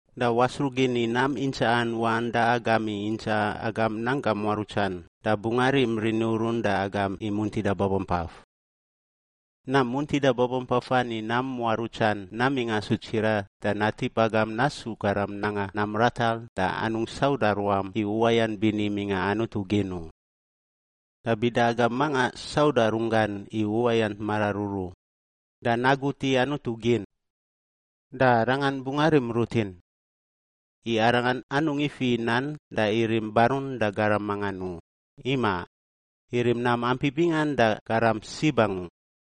da wasruꞌ gin i nam intsaꞌan waꞌan da agam i intsaꞌa agam nanggam muarutsan da bungꞌ arim rini urun da agam i muntida babampaf. Nam muntida babampafan i nam muarutsan namingꞌ asu tsiraꞌ da natip agam nasu garam nanga nam ratar da anungꞌ sauda ruam i uwayant bini mingꞌa Anutu gin u. Da bida agam manga sauda runggan i uwayant mararuru da nagut i Anutu gin, da Arangan bungꞌ arim rutin. I Arangan anungꞌ ifiꞌ i nan da irim barun da garam mangan u. Imaꞌ! Irim nam ampi bingan da garam sib angu.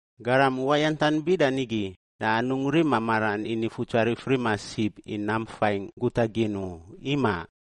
Garam uwayantan bida nigi da anungꞌ rima maran i Nifutsarif rima sib i nam faingꞌ guta gin u. Imaꞌ!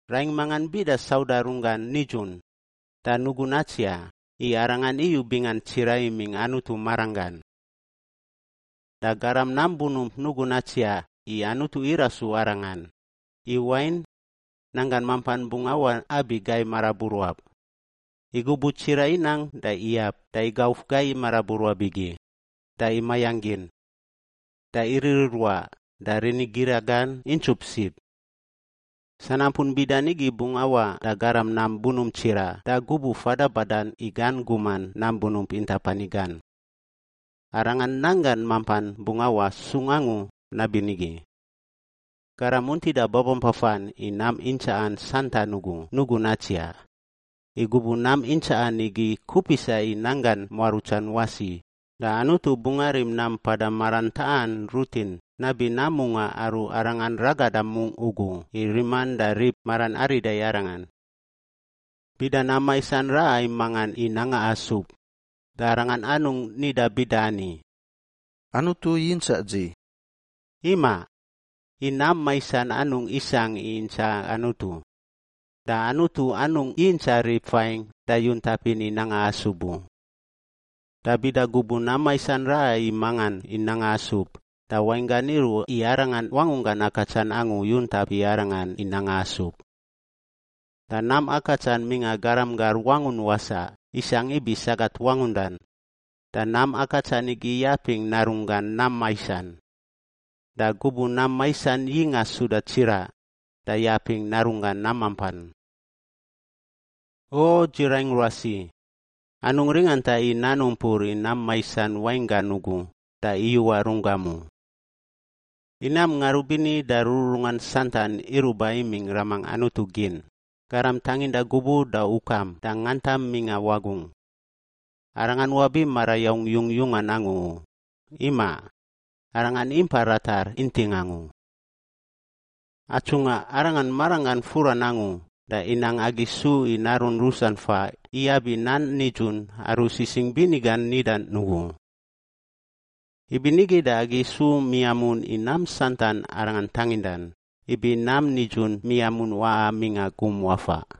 Raingꞌ mangan bida sauda runggan nidzun, da nugun natsiaꞌ i arangan iyu bingan tsiraꞌ imingꞌ Anutu maranggan. Da garam nam bunump, nugun natsiaꞌ i Anutu irasu arangan, i wain, nanggan mampan bungꞌ awaꞌ abi gai maraburuab. I gubuꞌ tsiraꞌ inang da iyab da igauf gai maraburuab igi, da imayangꞌ gin, da iririruaꞌ da rini gira gan intsup sib. Sanampun bida nigi bungꞌ awaꞌ da garam nam bunump tsiraꞌ da gubuꞌ fada badan i gan guman nam bunump intap ani gan. Arangan nanggan mampan bungꞌ awaꞌ sung angu nabinigi. Garam muntida babampafan i nam intsaꞌan santan ugu nugun natsiaꞌ. I gubuꞌ nam intsaꞌan igi kupisa i nanggan muarutsan wasi, da Anutu bungꞌ arim nam mpada maran taꞌan rutin nabi nam mungaꞌ aru Arangan ragada mungꞌ ugu i riman da rib maran arida i Arangan. Bida nam maisan raꞌa i mangan i nanga asub, da arangan anungꞌ nida bida ani, “Anutu yintsaꞌ dzi.” Imaꞌ! I nam maisan anungꞌ isangꞌ i intsaꞌa Anutu, da Anutu anungꞌ yintsaꞌ rib fain da yuntapin i nanga asub u. Da bida gubuꞌ nam maisan raꞌa i mangan i nanga asub, da wainggan iruꞌ i arangan wangunggan akatsan angu yuntap i arangan i nanga asub. Da nam akatsan mingꞌa garam gar wangun wasaꞌ isangꞌ ibi sagat wangundan, da nam akatsan igi yapingꞌ narunggan nam maisan. Da gubuꞌ nam maisan yingꞌa suda tsiraꞌ da yapingꞌ narunggan nam mampan. O, dzi raingꞌ ruasi, anungꞌ ringanta i nan umpur i nam maisan wainggan ugu da iyuꞌa runggam u. I nam ngarubini da rururungan santan iruꞌ ba imingꞌ Ramangꞌ Anutu gin, Garam tanginda gubuꞌ da ukam da ngantam mingꞌa wagungꞌ. Arangan wabi marayaung yungyungan angu u. Imaꞌ! Arangan impa ratar inting angu. Atsungꞌa Arangan maranggan furan angu da inang agi isu i narun rusan faꞌ iyab i nan nidzun aru Sisingꞌ Bini gan nidan ugu; ibinigi da agi su miamun i nam santan Arangan tangindan, ibi nam nidzun miamun waꞌa mingꞌa gum wafaꞌ.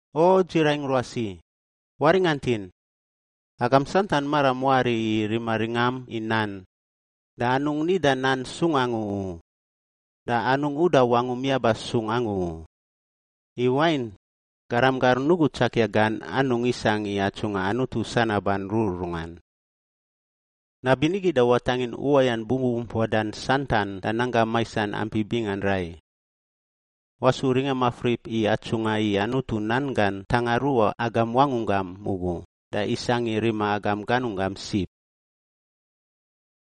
O, dzi raingꞌ ruasi, waringantin: Agam santan maram wari i rima ringam i nan, da anungꞌ nidan nan sung angu u da anungꞌ uda wangum yaba sung angu u, i wain, garam gar nugu tsakia gan anungꞌ isangꞌ i atsungꞌa Anutu sanaban rururungan. Nabinigi, da watangin uwayant bubumpuadan santan da nanggam maisan ampi bingan rai. Wasu ringa mafrip i atsungꞌa i Anutu nan gan ntanga ruꞌa agam wangunggam ugu da isangꞌ i rima agam ganunggam sib.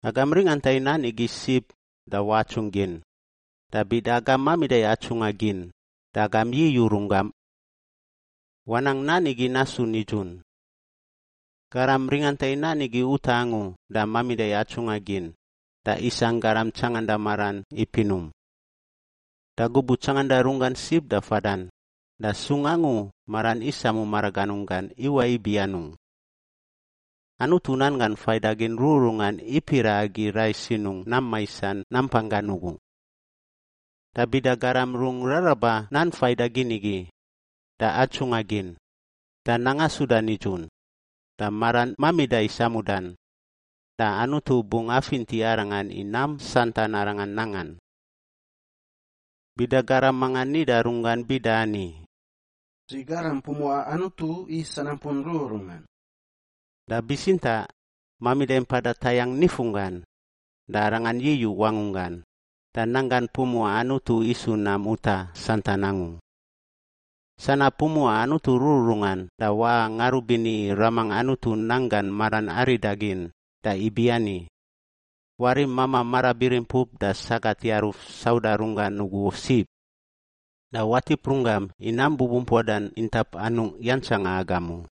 Agam ringanta i nan igi sib da watsungꞌ gin. Da bida agam mamida i atsungꞌa gin, da agam yiyuꞌ runggam. Wanang nan igi nasu nidzun. Garam ringanta i nan igi utaꞌ angu da mamida i atsungꞌa gin, da isangꞌ garam tsanganda maran i pinum. Da gubuꞌ tsanganda runggan sib da fadan, da sung angu maran isamu maraganunggan iwaꞌ ibi anungꞌ. Anutu nan gan faidagin rururungan ipiraꞌ agi rai sinungꞌ nam maisan nampanggan ugu. Da bida garam rungꞌ raraba nan faidagin igi, da atsungꞌa gin, da nanga suda nidzun, da maran mamida i samudan, da Anutu bungꞌ afinti arangan i nam santan arangan nangan. Bida garam manga nida runggan bida ani, “Dzi garam pumuꞌa Anutu i sanampun rururungan,” da bitsintaꞌ mamida i mpada tayangꞌ nifunggan, da arangan yiyuꞌ wangunggan, da nanggan pumuꞌa Anutu isu nam utaꞌ santan angu. Sanab pumuꞌa Anutu rururungan da waꞌa ngarubini i Ramangꞌ Anutu nanggan maran arida gin da ibiani: Warim mamaꞌ marabirimpup da sagat yaruf sauda runggan ugu sib, da watip runggam i nam bubumpuadan intap anungꞌ yantsanga agam u.